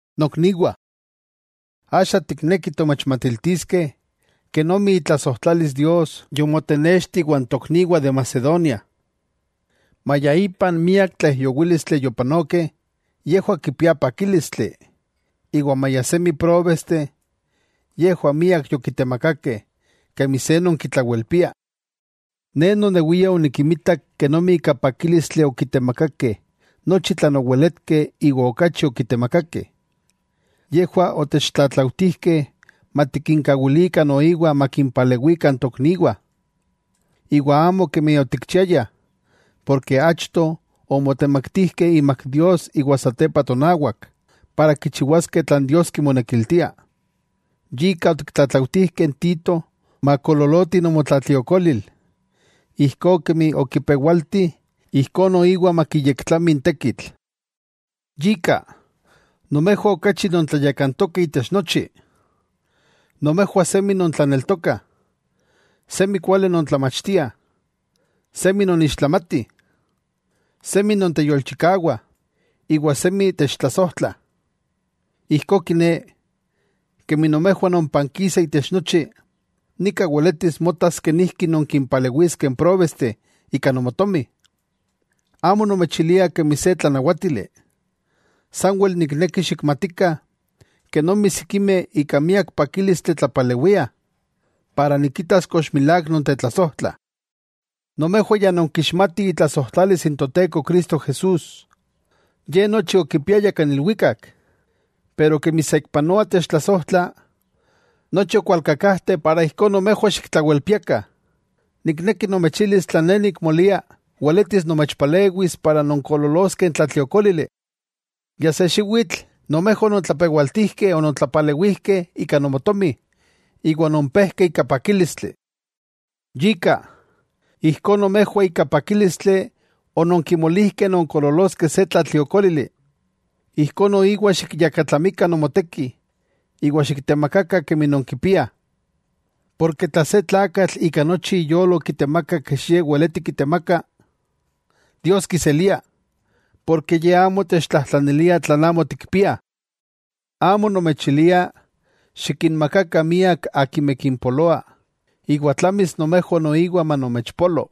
Nokniwah, axa tiknekih tomechmatiltiskeh kenomi itlasojtlalis Dios yomotenexti iwan tokniwah de Macedonia. Maya ipan miak tlaijyowílistli yopanokeh, yejwah kipiah pakílistli, iwa maya semi próbesteh, yejwah miak yokitemakakeh kemi se non kitlawelpia. Ne nonewia onikinmitak kenomi ika pakílistli okitemakakeh nochi tlan oweletkeh iwa okachi okitemakakeh. Yejwah otechtlatlautijkeh matikinkawilikah noiwa makimpalewikah n tokniwah. Iwa amo kemi otikchiayah, porke achto omotemaktijkeh imak Dios iwa satepa tonawak, para kichiwaskeh tlan Dios kimonekiltia. Yika otiktlatlautijkeh n Tito makoololoti nomotlatliokolil, ijkó kemi okipewalti ijkó noiwa makiyektlami n tekitl. Yika, nomejwah okachi non tlayakantokeh itech nochi. Nomejwah semi nontlaneltokah, semi kuali non tlamachtiah, semi non ixtlamatih, semi nonteyolchikawah iwa semi techtlasojtlah. Ijkó kiné, kemi nomejwah nonpankisa itech nochi, nika weletis motas kenijki nonkimpalewiskeh n próbesteh ika nomotomi. Amo nomechilia kemi se tlanawátili, sanwel nikneki xikmatikah kenomi sikimeh ika miak pakílistli tlapalewiah, para nikitas kox milák nontetlasojtlah. Nomejwah ya nonkixmatih itlasojtlalis n Toteko Cristo Jesús. Ye nochi okipiaya kan ilwikak, pero kemi saikpanoa techtlasojtla, nochi okwalkakajte para ijkó nomejwah xiktlawelpiakah. Nikneki nomechilis tlan ne nikmolia weletis nomechpalewis para nonkoololoskeh n tlatliokólili. Ya se xiwitl, nomejwah onontlapewaltijkeh onontlapalewijkeh ika nomotomi iwa ononpejkeh ika pakílistli. Yika, ijkó nomejwah ika pakílistli ononkimolijkeh nonkoololoskeh se tlatliokólili, ijkó noiwa xikyakatlamikah nomoteki iwa xiktemakakah kemi nonkipiah. Porke tla se tlakatl ika nochi iyolo kitemaka kech ye weleti kitemaka, Dios kiselia, porke Ye amo techtlajtlanilia tlan amo tikpiah. Amo nomechilia xikinmakakah miak akimeh kimpoloa iwa tlamis nomejwah noiwa manomechpolo,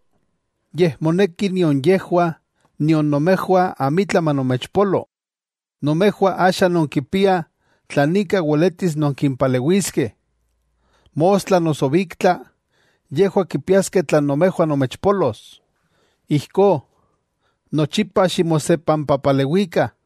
yej moneki nion yejwah nion nomejwah amitla manomechpolo. Nomejwah axa nonkipiah tlan ika weletis nonkimpalewiskeh. Mostla noso biktla yejwah kipiaskeh tlan nomejwah nomechpolos. Ijkó, nochipa ximosepampapalewikah.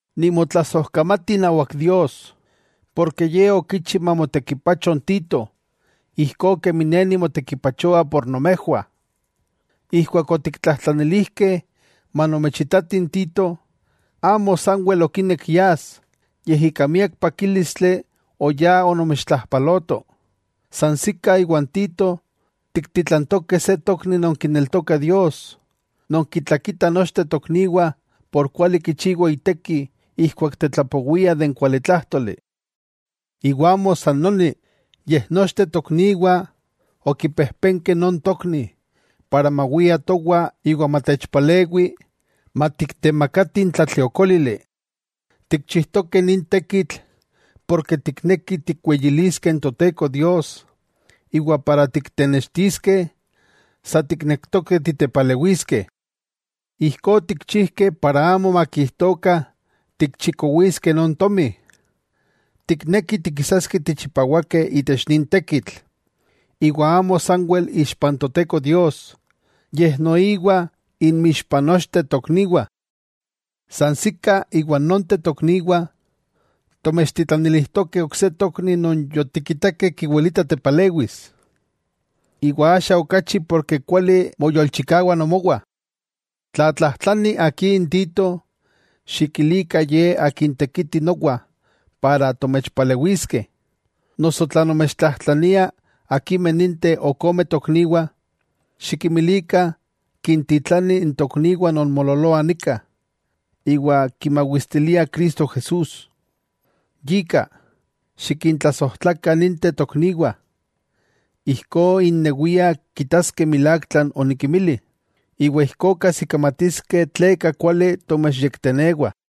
Nimotlasojkamati inawak Dios, porke Ye okichi mamotekipacho n Tito, ijkó kemi ne nimotekipachoa por nomejwah. Ijkuak otiktlajtlanilijkeh manomechitati n Tito, amo sanwel okinek yas, yej ika miak pakílistli oyá onomechontlajpaloto. Sansikah iwa n Tito tiktitlantokeh se tokni non kineltoka Dios, non kitlakitah nochteh tokniwah por kuali kichiwa iteki ijkuak tetlapowia de n kualitlájtoli. Iwa amo san noni, yej nochteh tokniwah okipejpenkeh non tokni mawia towah iwa matechpalewi matiktemakatih n tlatliokólili. Tikchijtokeh nin tekitl porke tiknekih tikweyiliskeh n Toteko Dios iwa tiktenextiskeh sa tiknektokeh titepalewiskeh. Ijkó otikchijkeh para amo makijtokah tikchikowiskeh non tomi. Tiknekih tikisaskeh tichipawakeh itech nin tekitl, iwa amo sanwel ixpa n Toteko Dios, yej noiwa inmixpah nochteh tokniwah. Sansikah iwa nonteh tokniwah, tomechtitlanilijtokeh ok se tokni non yotikitakeh kiwilita tepalewis, iwa axa okachi porke kuali moyolchikawa nomowah. Tla aka tlajtlani akí n Tito, xikilikah ye tekiti nowa para tomechpalewiskeh. Noso tla nomechtlajtlaniah akimeh ninteh ok ome tokniwah, xikinmilikah kintitlanih n tokniwah non moololoah nika, iwa kimawistiliah Cristo Jesús. Yika, xikintlasojtlakah ninteh tokniwah, ijkó innewiah kitaskeh milák tlan onikimilih, iwa ijkó kajsikamatiskeh tleka kuali tomechyektenewah.